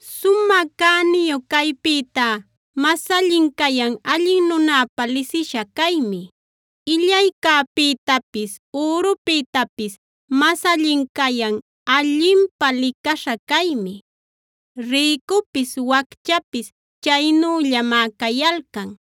Sumä cäniyu caypïtá mas allin cayan allin nunapä lisisha caymi; illaycäpïtapis, ürupïtapis mas allin cayan allinpä licaśha caymi. Rïcupis wacchapis chaynüllamá cayalcan;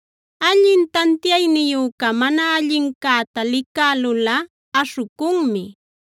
Allin tantiayniyüca mana allincäta licälulꞌa aśhucunmi;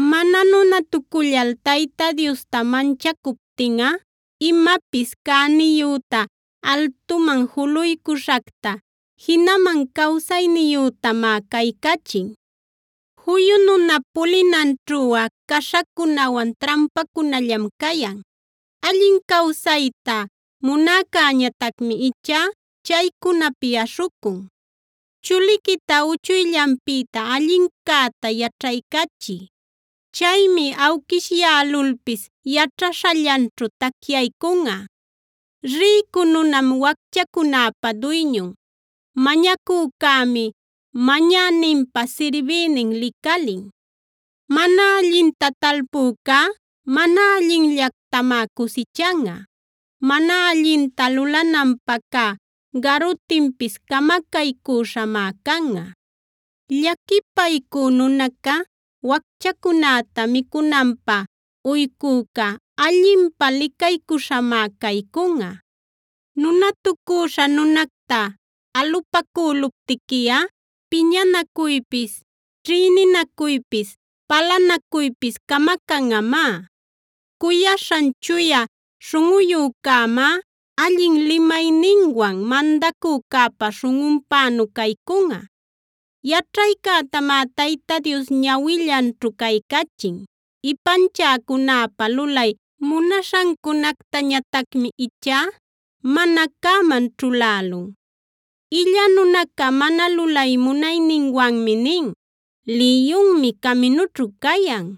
Mana nunatucullal Tayta Diosta manchacuptinꞌa imapis cäniyüta, altuman juluycuśhacta, jinaman cawsayniyütamá caycachin. Juyu nunap pulinanćhuꞌa caśhacunawan trampacunallam cayan; allin cawsayta munäcäñatacmi ichá chaycunapi aśhucun. Chuliquita uchuyllanpïta allincäta yaćhaycachiy; chaymi awquishyälulpis yaćhaśhallanćhu tacyaycunꞌa. Rïcu nunam wacchacunäpa duyñun; mañacücämi mañäninpa sirbïnin licalin. Mana allinta talpücá, mana allinllactamá cusichanꞌa; mana allinta lulananpä cä garutinpis camacaycüśhamá canꞌa. Llaquipaycü nunaca, wacchacunäta micunanpä uycüca allinpä licaycuśhamá caycunꞌa. Nunatucüśha nunacta alupacüluptiquiꞌa piñanacuypis, ćhïninacuypis, palanacuypis camacanꞌamá. Cuyaśhan chuya śhunꞌuyücämá allin limayninwan mandacücäpa śhunꞌunpänu caycunꞌa. Yaćhaycätamá Tayta Dios ñawillanćhu caycachin; ipanchäcunäpa lulay munaśhancunactañatacmi ichá mana cäman ćhulälun. Illa nunaca mana lulay munayninwanmi nin: “Liyunmi caminućhu cayan;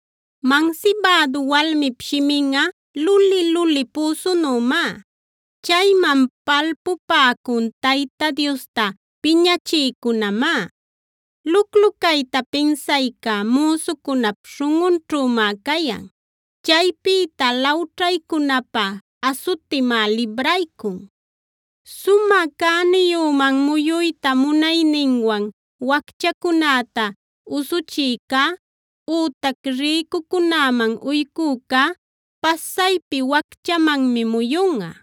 Mansibädu walmip shiminꞌa luli-luli püsunümá; chayman palpupäcun Tayta Diosta piñachïcunämá. Luclu cayta pinsayca müsucunap śhunꞌunćhümá cayan; chaypïta lawćhaycunapä asutimá libraycun. Sumä cäniyüman muyuyta munayninwan wacchacunäta usuchïcá ütac rïcucunäman uycücá pasaypi wacchamanmi muyunꞌa.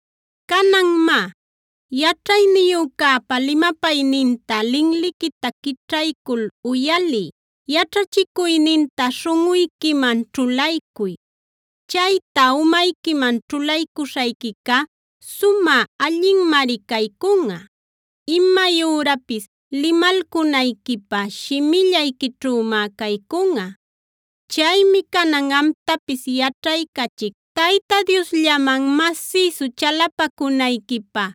Canan má, yaćhayniyücäpa limapayninta linliquita quićhaycul uyaliy; yaćhachicuyninta śhunꞌuyquiman ćhulaycuy. Chayta umayquiman ćhulaycuśhayquica sumä allinmari caycunꞌa; imay ürapis limalcunayquipä shimillayquićhümá caycunꞌa. Chaymi canan amtapis yaćhaycachic Tayta Diosllaman masïsu chalapacunayquipä.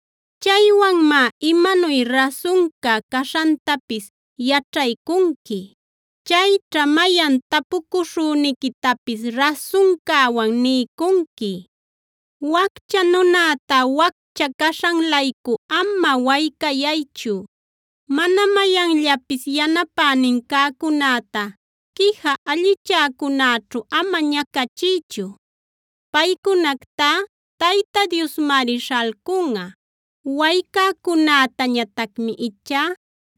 Chaywanmá imanuy rasunca caśhantapis yaćhaycunqui. Chayćha mayan tapucuśhüniquitapis rasuncäwan niycunqui. Waccha nunäta waccha caśhan-laycu ama waycayaychu; mana mayanllanpis yanapänin cäcunäta quija allichäcunäćhu ama ñacachiychu. Paycunactá Tayta Diosmari śhalcunꞌa; waycäcunätañatacmi ichá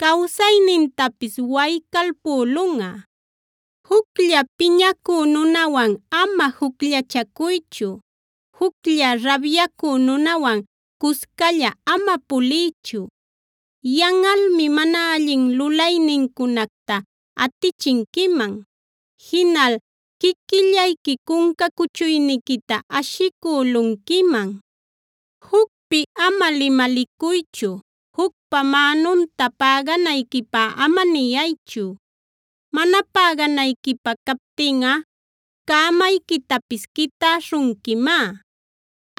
cawsaynintapis waycalpülunꞌa. Juclla piñacü nunawan ama jucllachacuychu; juclla rabyacü nunawan cuscalla ama puliychu. Yanꞌalmi mana allin lulaynincunacta atichinquiman, jinal quiquillayqui cunca cuchuyniquita ashicülunquiman. Jucpi ama limalicuychu; jucpa mänunta päganayquipä ama niyaychu. Mana päganayquipä captinꞌa cämayquitapis quitäśhunquimá.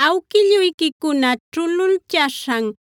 Awquilluyquicuna ćhululchaśhan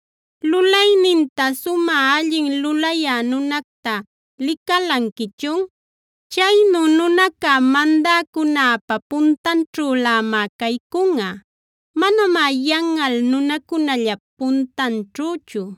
¿Lulayninta sumä allin lulayä nunacta licalanquichun? Chaynu nunaca mandäcunäpa puntanćhülämá caycunꞌa; manamá yanꞌal nunacunallap puntanćhüchu.